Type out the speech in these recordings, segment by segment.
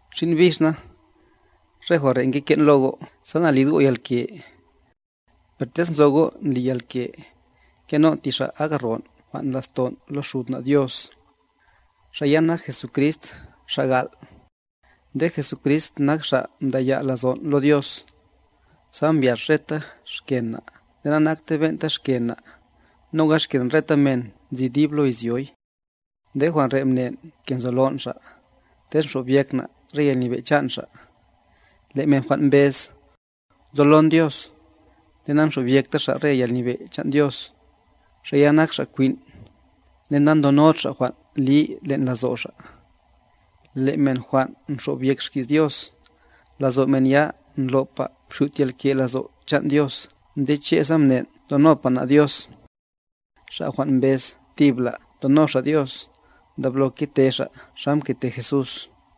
Xin' bix na, re jwan' re' ngeke'n lo go' sa nalid go' yalke. Per tez nzo go' ndli yalke, ngenon' ti Xa' ak ron' jwan' ndla'ston' lo Xud na' Dios, Xa' ya nak Jesucrist, Xa' gal'. Nde Jesucrist nak Xa' mdaya' lazon' lo Dios, sa mbyax reta xken na' nde na'nakte ben'ta xken na', noga xken reta men nzi dib lo izyoy. Nde jwan' re' mnen' ke nzolon' Xa', tez xobyek na' re yalnyebe' chan' Xa'. Le' men jwan' mbez: “Nzolon Dios”, nde nanxobyekta xa' re yalnyebe' chan' Dios, xa' ya nak xa' kwin', nde na'ndonod xa' jwan' li len' lazo' xa'. Le' men jwan' nxobyek xki's Dios, lazo' men ya ndlo'pa mxyut yalke' lazo' chan' Dios nde che' sa mnen' ndonopa na' Dios. Xa' jwan' mbez tibla' ndono xa' Dios, ndablo kete xa' xa mkete Jesús.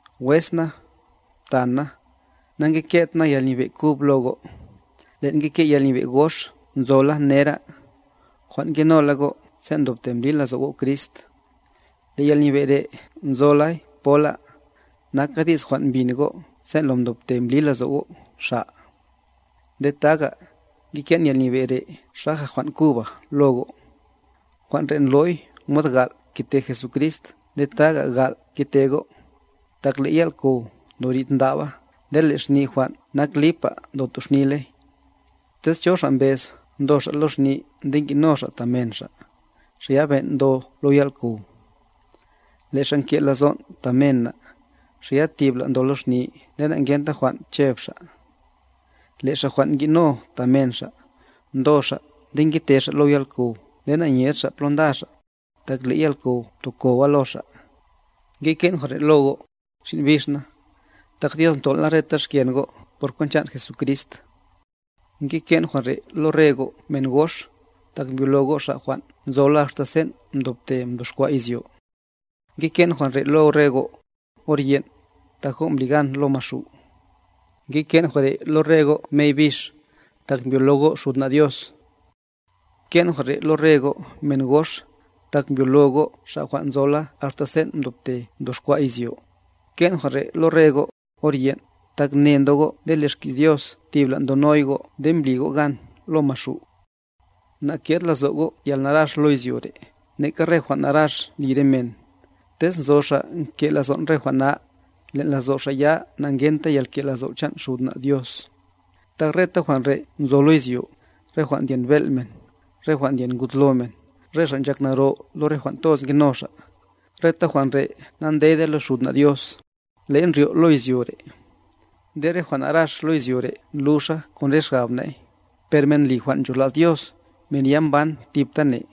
Wes na, ptan' na, na'ngeket na yalnyebe' kub lo go', le'n ngeke' yalnyebe' gox nzola nera', jwan' ngenola go' sen' mdobte mbli lazo' go' Crist. Le' yalnyebe' re' nzolay pola, naka di's jwan' mbin go' sen' lo mdobte mbli lazo' go' Xa'. Nde taga, ngeke'n yalnyebe' re' xaja jwan' kuba lo go', jwan' re' ndlo'y mod gal' mkete Jesucrist nde taga' gal' ngete go', tak le' yal'kow ndorid ndaba nde le' xni jwan' nak lipa ndotoxniley. Tez cho xa' mbez ndo xa' lo xni nde ngi'no xa' ta men xa', xa' ya ben' ndo lo yal'kow. Le' xa' nke' lazon' ta men na', xa' ya tibla' ndo lo xni nde na'ngenta jwan' cheb xa'. Le' xa' jwan' ngi'no ta men xa', ndo xa' nde ngete xa' lo yal'kow nde na'nyed xa' plo nda xa', tak le' yal'kow mtokowa lo xa'. Ngeke'n jwan' re' lo go', xin' bix na, tak Dios mton'la reta xken go' por kwent chan' Jesucrist. Ngeke'n jwan' re' lo re go' men gox, tak mbyolo go' Xa' jwan' nzola axta sen' mdobte mdoxkwa' izyo. Ngeke'n jwan' re' lo re go', or yen', tak go' mbli gan lo maxu'. Ngeke'n jwan' re' lo re go' mey bix, tak mbyolo go' Xud na' Dios. Mke'n jwan' re' lo re go' men gox, tak mbyolo go' Xa' jwan' nzola axta sen' mdobte mdoxkwa' izyo. Mke'n jwan' re' lo re go', or yen', tak ne ndo go' nde le' xki's Dios tibla' ndonoy go' nde mbli go' gan lo maxu'. Na'ke'd lazo' go' yalnarax lo izyo re', neka re jwan' narax ndli re men. Tez nzo xa' nke' lazon' re jwan' na, len' lazo' xa' ya na'ngenta yalke' lazo' chan' Xud na' Dios. Tak reta jwan' re' nzo lo izyo, re jwan' ndyen bel' men, re jwan' ndyen ngud lo men nde re xa' nchak naro lo re jwan' toz ngeno xa', reta jwan' re' na'ndede lo Xud na' Dios, le'y ndryo' lo izyo re'. Nde re jwan' narax lo izyo re' ndluxa kon re xgab na'y, per men ndli jwan' ncholas Dios, men ya mban thiptane.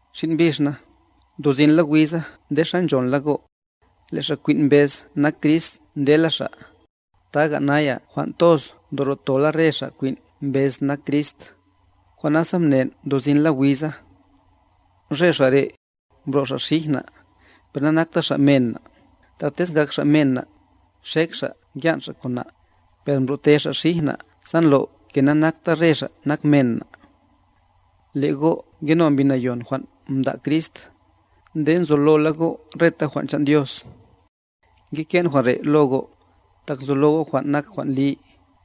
Xin' bix na, ndosinla wiza nde xa nchonla go', le' xa' kwin' mbez nak Crist ndela xa', taga naya jwan' toz ndoro'tola re xa' kwin' mbez nak Crist, jwan' nasa mnen' ndosinla wiza. Re xa' re', mbro' xa' xij na', per na'nakta xa' men na', tak tez ngak xa' men na', nxek xa' ngyan' xa' kon na', per mbro'te xa' xij na' sa ndlo' ke na'nakta re xa' nak men na'. Le' go' ngeno Mbi Nayon jwan' mda' Crist, nde nzolola go' reta jwan' chan' Dios. Ngeke'n jwan' re' lo go', tak nzolo go' kwan nak jwan' li,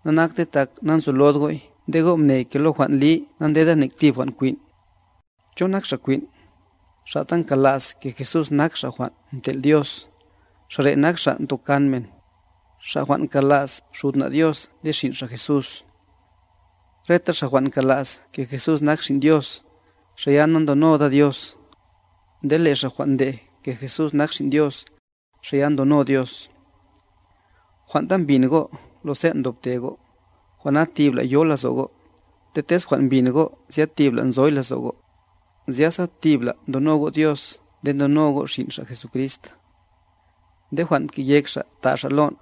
na'nakte tak na'nzolod go'y nde go' mne ke lo jwan' li na'ndeda nek tib jwan' kwin'. ¿Cho nak xa' kwin'? Xa' ta nkala's ke Jesús nak Xa' jwan' mtel' Dios, xa' re' nak xa' ntokan men, xa' jwan' nkala's Xud na' Dios nde Xin' Xa' Jesús. Reta xa' jwan' nkala's le' Jesús nak Xin Dios, xa' ya nandonoda Dios, nde le' xa' jwan' ndej le' Jesús nak Xin' Dios, xa' ya ndono Dios. Jwan' ta mbin go' lo sen' mdobte go', jwan' na tibla' yo lazo' go', nde tez jwan' mbin go' zya tibla' nzoy lazo' go', zyasa tibla' ndono go' Dios nde ndono go' Xin' Xa' Jesucrist. Nde jwan' mke'yek Xa' ta' Xa' lon',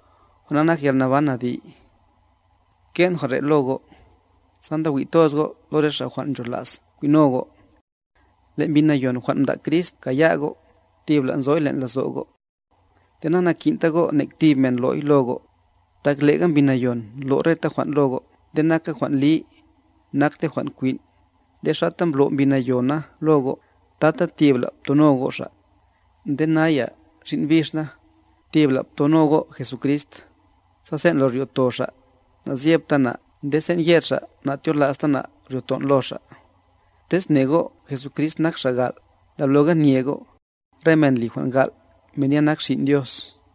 jwan' na nak yalnaban adi'. Mke'n jwan' re lo go', sa ndawi' toz go' lo re xa' jwan' nchola's kwin'no go'. Le' Mbi Nayon jwan' mda' Crist mkaya' go', tibla' nzoy len' lazo' go'. Nde na'nakin'ta go' nek tib men lo'y lo go', tak le'ga Mbi Nayon ndlo' reta jwan' lo go' nde naka jwan' li, nakte jwan' kwin', nde xata mblo' Mbi Nayona lo go', tata tibla' ptono go' Xa'. Nde naya, xin' bix na, tibla ptono go' Jesucrist, sa sen' lo ryo'to Xa', na'zyepta na' nde sen' yed Xa' na'tyola'sta na' ryo'ton' lo Xa'. Tez mne go' Jesucrist nak Xa' gal', ndabloga nye go', re men ndli jwan' gal', men ya nak xin' Dios.